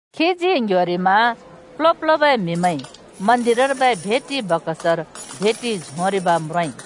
खीजी ङ्ह्‍योरिमा प्ल्हो-प्ल्होबै म्हिमैंइ मन्दिरर्बै भेटि बकसर भेटि झोंरिब् म्रोंइ।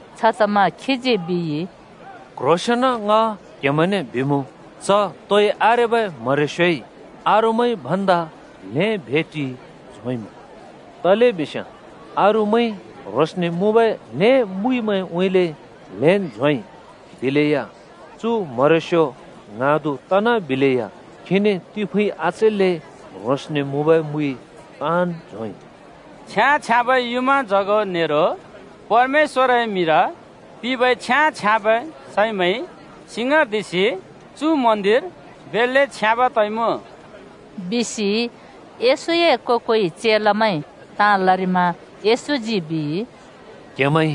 छतमा खीजी बिइ, “क्‍ह्रोंसेन ङ क्‍हेमैंने बिमुँ, च तोइ आरेबै म्हरेस्‍योइ अरूमैंइ भन्दा ल्‍हें भेटि झोंइमुँ। तलेबिस्याँ अरूमैंइ ह्रोंसने मुँबै ल्हें मुइमैंउँइँले ल्हेंन् झोंइ, दिलेया चु म्हरेस्‍यो ङ्हाँदु तनाबिलेया खीने तिफुँइ आचैल्‍ले ह्रोंसने मुँबै मुइ ताँन् झोंइ।” “छ्याँ-छ्याँबै युँमाजगो नेरो परमेश्‍वरए मिंर पिंबै छ्याँ-छ्याँबै सैमैंइ सिङाँर्दिसि चु मन्दिर बेल्‍ले छ्याँब् तइमुँ,” बिसि येशूए को-कोइ चेलामैंइ ताँ लरिमा येशूजी बिइ, “क्‍हेमैंइ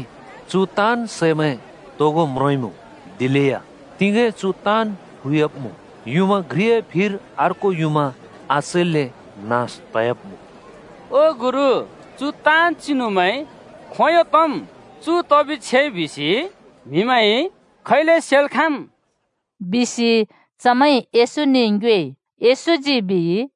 चु ताँन् सैमैं तोगो म्रोंइमुँ, दिलेया तिगें चु ताँन् फुयाब्‍मुँ। युँमा घ्रिए फिर अर्को युँमा आचैल्‍ले नास तयाब्‍मुँ।” “ओ गुरु, चु ताँन् चिनुमैं खोंयों तम्? चु तबि छेइ बिसि म्हिमैंइ खैले सेल् खाँम्?” बिसि चमैंइ येशूने ङ्योएइ। येशूजी बिइ,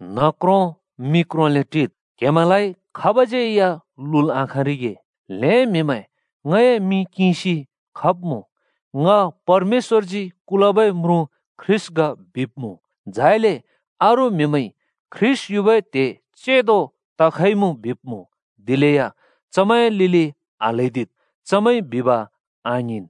“न्ह क्रों मि क्रोंले टिद्, क्हेमैंलाइ खाबज्यै लुल् आखाँरिगे। ल्‍हें म्हिमैं ङए मिं किंसि खब्मुँ, ‘ङ परमेश्वरजी कुलबै म्रुँ ख्रीष्‍ट ग’ बिब्‍मुँ, झाइले अरू म्हिमैंइ ‘ख्रीष्‍ट युबै त्‍हे चेंदो तखइमुँ’ बिब्‍मुँ, दिलेया चमैंए लिलि आल्‍हैदिद्, चमैंइ बिब आङिंन्।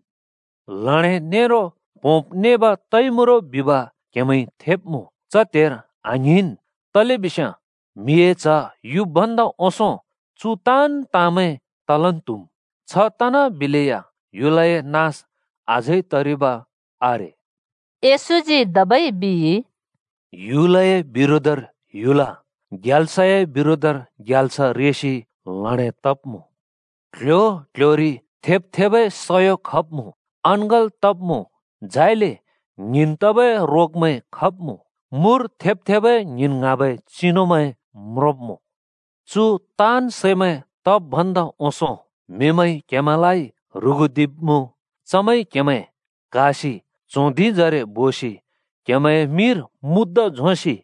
ल्हडें नेरो प्‍होंब् नेब तइमुँ रो बिब क्हेमैंइ थेब्मुँ च त्हेर आङ्हिंन् तलेबिस्याँ म्हिए च्ह युब् भन्दा ओंसों चु ताँन् ताँमैं तलन् त्‍हुम्। छ तनाबिलेया ह्‍युलए नास अझै तरिब आरे।” येशूजी धबै बिइ, “ह्‍युलए बिरोधर ह्‍युल, ग्याल्सए बिरोधर ग्याल्स रेसि ल्हडें तब्‍मुँ। क्‍ल्‍ह्‍यो क्‍ल्‍ह्‍योरि थेब् थेबै सयो खब्मुँ, अङ्गल तब्‍मुँ, झाइले ङ्हिंन् तबै रोगमैं खब्मुँ। मुर थेब् थेबै ङ्हिंन् ङ्हाँबै चिनुमैं म्रोंब्‍मुँ। चु ताँन् सैमैं तब् भन्दा ओंसों म्हिमैंइ क्हेमैंलाइ ह्रुगुदिब्‍मुँ। चमैंइ क्‍हेमैं क्हासि च्हों धिंजरे बोसि क्हेमैंए मिंर मुद्दा झोंसि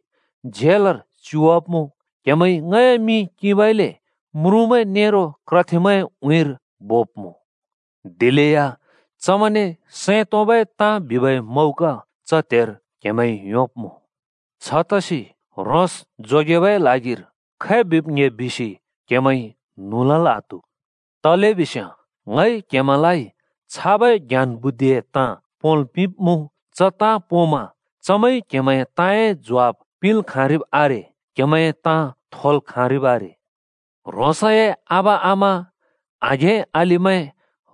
झेलर च्युवाब्‍मुँ। क्हेमैंइ ङए मिं किंबइले म्रुँमैं नेरो क्रथेमैंए उँइँर बोब्‍मुँ। दिलेया चमैंने सैं तोंबै ताँ बिबै मौका च त्हेर क्हेमैंइ योंब्‍मुँ। छतसि ह्रोंस जोगेबै ल्हागिर खै बिब् ङ्‍हे बिसि क्हेमैंइ न्हुँ लल् आत्हु। तलेबिस्याँ ङइ क्‍हेमैंलाइ छाबै ज्ञान बुद्धिए ताँ पोंल् पिंब्मुँ, च ताँ पोंमा चमैंइ क्‍हेमैंए ताँए ज्वाफ पिंल् खाँरिब् आरे, क्हेमैंए ताँ थोल् खाँरिब् आरे। ह्रोंसए आबा-आमा, आघें-अलिमैं,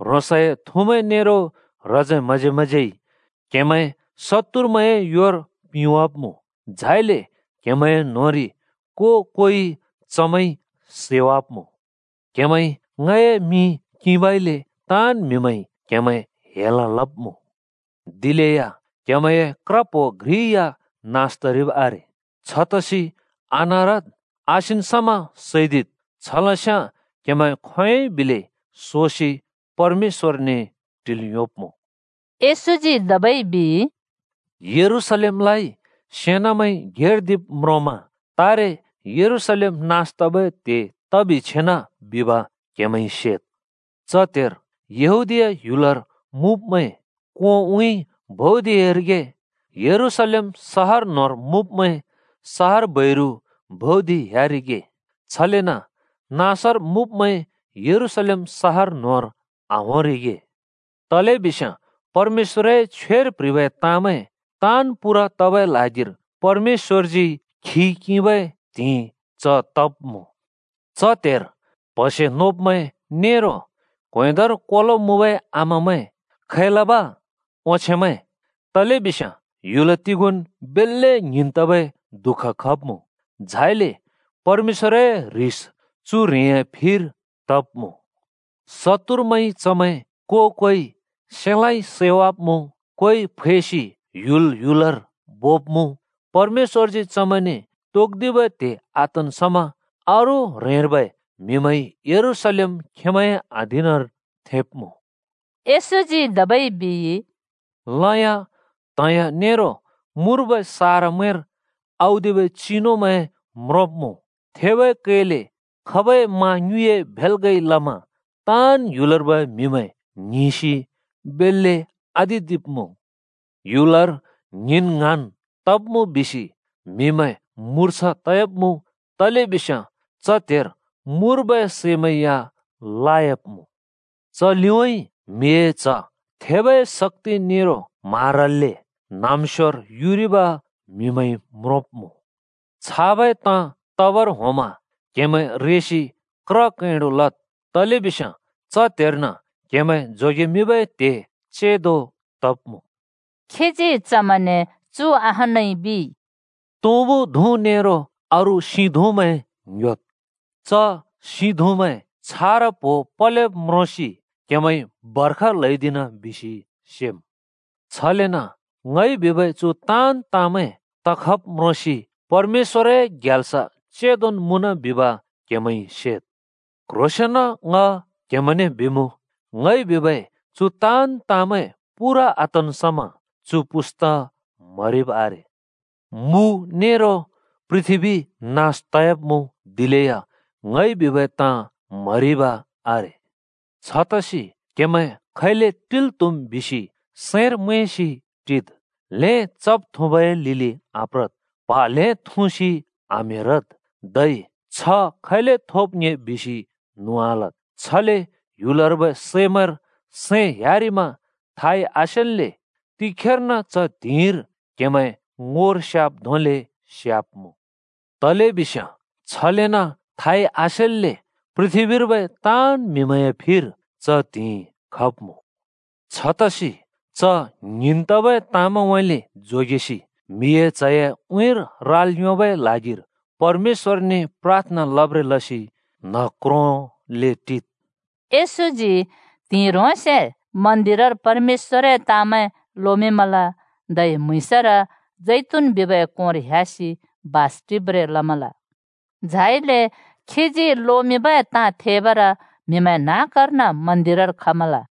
ह्रोंसए थुमैं नेरो ह्रजे-म्हजेमैंज्यै क्‍हेमैं शत्तुरमैंए योर पिंवाब्‍मुँ, झाइले क्हेमैंए न्होंरि को-कोइ चमैंइ सैवाब्‍मुँ। क्‍हेमैंइ ङए मिं किंबइले ताँन् म्हिमैंइ क्हेमैं हेल लब्‍मुँ। दिलेया क्‍हेमैंए क्र प्हो घ्रि या नास तरिब् आरे। छतसि आनारद्, आसिन् समा सैदिद्, छलस्याँ क्‍हेमैं खोंयोंइ बिलै सोसि परमेश्‍वरने टिल् योंब्मुँ।” येशूजी धबै बिइ, “यरूशलेमलाइ सेनामैंइ घेर्दिरिब् म्रोंमा तारे यरूशलेम नास तबै त्हे तबि छेना बिब क्हेमैंइ सेद्। च त्‍हेर यहूदीया ह्‍युलर मुँब्‍मैं कोंउँइँ भौदिरिगे। यरूशलेम सहर न्‍होंर मुँब्‍मैं सहर बैरु भौदिह्‍यारिगे, छलेन नाँसर मुँब्‍मैं यरूशलेम सहर न्‍होंर आहोंरिगे। तलेबिस्याँ परमेश्‍वरए छ्वेर प्ह्रिबै ताँमैं ताँन् पूरा तबै ल्हागिरि परमेश्‍वरजी बदला किंबै त्‍हिंइ च तब्‍मुँ। च त्‍हेर प्‍हसे नोब्‍मैं नेरो क्‍वेंदर कोलो मुँबै आमामैं खै लब ओंछेंमैं! तलेबिस्याँ ह्‍युल तिगोंन् बेल्‍ले ङ्हिंन् तबै दुःख खब्मुँ, झाइले चु ह्रेंए फिर परमेश्‍वर ह्रिस खब्मुँ। शत्तुरमैंइ चमैं को-कोइ सेलाँइ (तरवारइ) सैवाब्‍मुँ, कोइ फैसि ह्‍युल ह्‍युलर बोब्‍मुँ। परमेश्‍वरजी चमैंने तोक्‍दिबै त्‍हे आतन् समा अरू ह्रेंर्बै म्हिमैंइ यरूशलेम खेंमैंए अधीनर थेंब्मुँ।” येशूजी धबै बिइ, “लयाँ, त्‍हिंयाँ नेरो मुर्बै सारामैंर औदिबै चिनुमैं म्रोंब्‍मुँ। थेबै कैले खबै मा ङ्युँइए भेल्‍गइ लमा ताँन् ह्‍युलर्बै म्‍हिमैं ङ्हिंसि बेल्‍ले आतिदिब्‍मुँ। ह्‍युलर ङ्हिंन् ङ्हाँन् तब्‍मुँ बिसि म्‍हिमैं मुर्छा तयाब्मुँ। तलेबिस्याँ च त्हेर मुर्बै सैमैं या लायाब्मुँ‌। च लिउँइँ म्हिए च्ह थेबै शक्‍ति नेरो म्हारल्‍ले न्‍हाँम्‍स्योर युरिब म्हिमैंइ म्रोंब्‍मुँ। छाबै ताँ तबर होंमा क्‍हेमैं रेसि क्र कैंडु लद्। तलेबिस्याँ च त्‍हेर्न क्‍हेमैं जोगेमिंबै त्‍हे चेंदो तब्‍मुँ।” खीजी चमैंने चु अहानै बिइ, “तुँबु धुँ नेरो अरू सिं धुँमैं ङ्‍ह्‍योद्। च सिं धुँमैं छारा प्‍हो पलेब् म्रोंसि क्हेमैंइ बर्ख ल्‍हौदिना बिसि सेम्। छलेन ङइ बिबै चु ताँन् ताँमैं तखब् म्रोंसि परमेश्‍वरए ग्याल्स चेंदोन् मुँन बिब क्‍हेमैंइ सेद्। क्ह्रोंसेंन ङ क्हेमैंने बिमुँ, ङइ बिबै चु ताँन् ताँमैं पूरा आतन् समा चु पुस्ता म्हरिब् आरे। मु नेरो पृथ्‍बी नास तयाब्‍मुँ, दिलेया ङइ बिबै ताँ म्‍हरिब आरे। “छतसि क्हेमैं खैले टिल् त्‍हुम् बिसि सैंर मैंसि टिद्! ल्हें चब-थुँबाए लिलि आप्रद्, प्हा ल्‍हें थुँसि आम्हेरद् धै छ्ह खैले थोब् ङ्‍हे बिसि न्हुँ आलद्। छले ह्‍युलर्बै सैमैंर सैं ह्‍यारिमा थाइ आसेल्‍ले तिखेर्न च त्हिंइर क्हेमैं ङोर स्‍याब् धोंले स्याब्मुँ। तलेबिस्याँ छलेन थाइ आसेल्‍ले पृथ्‍बीर्बै ताँन् म्हिमैंए फिर च त्हिंइ खब्मुँ। छतसि च ङ्हिंन् तबै ताँमैंउँइँले जोगेसि म्हिए च्हए उँइँर राल् योंबै ल्हागिर परमेश्‍वरने प्राथना लब्रें लसि न्ह क्रोंले टिद्।” येशूजी त्हिंइ ह्रोंसे मन्दिरर परमेश्‍वरए ताँमैं लोमिंमल। धै म्‍हुँइँसर जैतून बिबै कोंर ह्‍यासि बास टिब्रें लमल। झाइले खीजी लोमिंबै ताँ थेबर म्हिमैं न्‍हाँकर्न मन्दिरर खमल।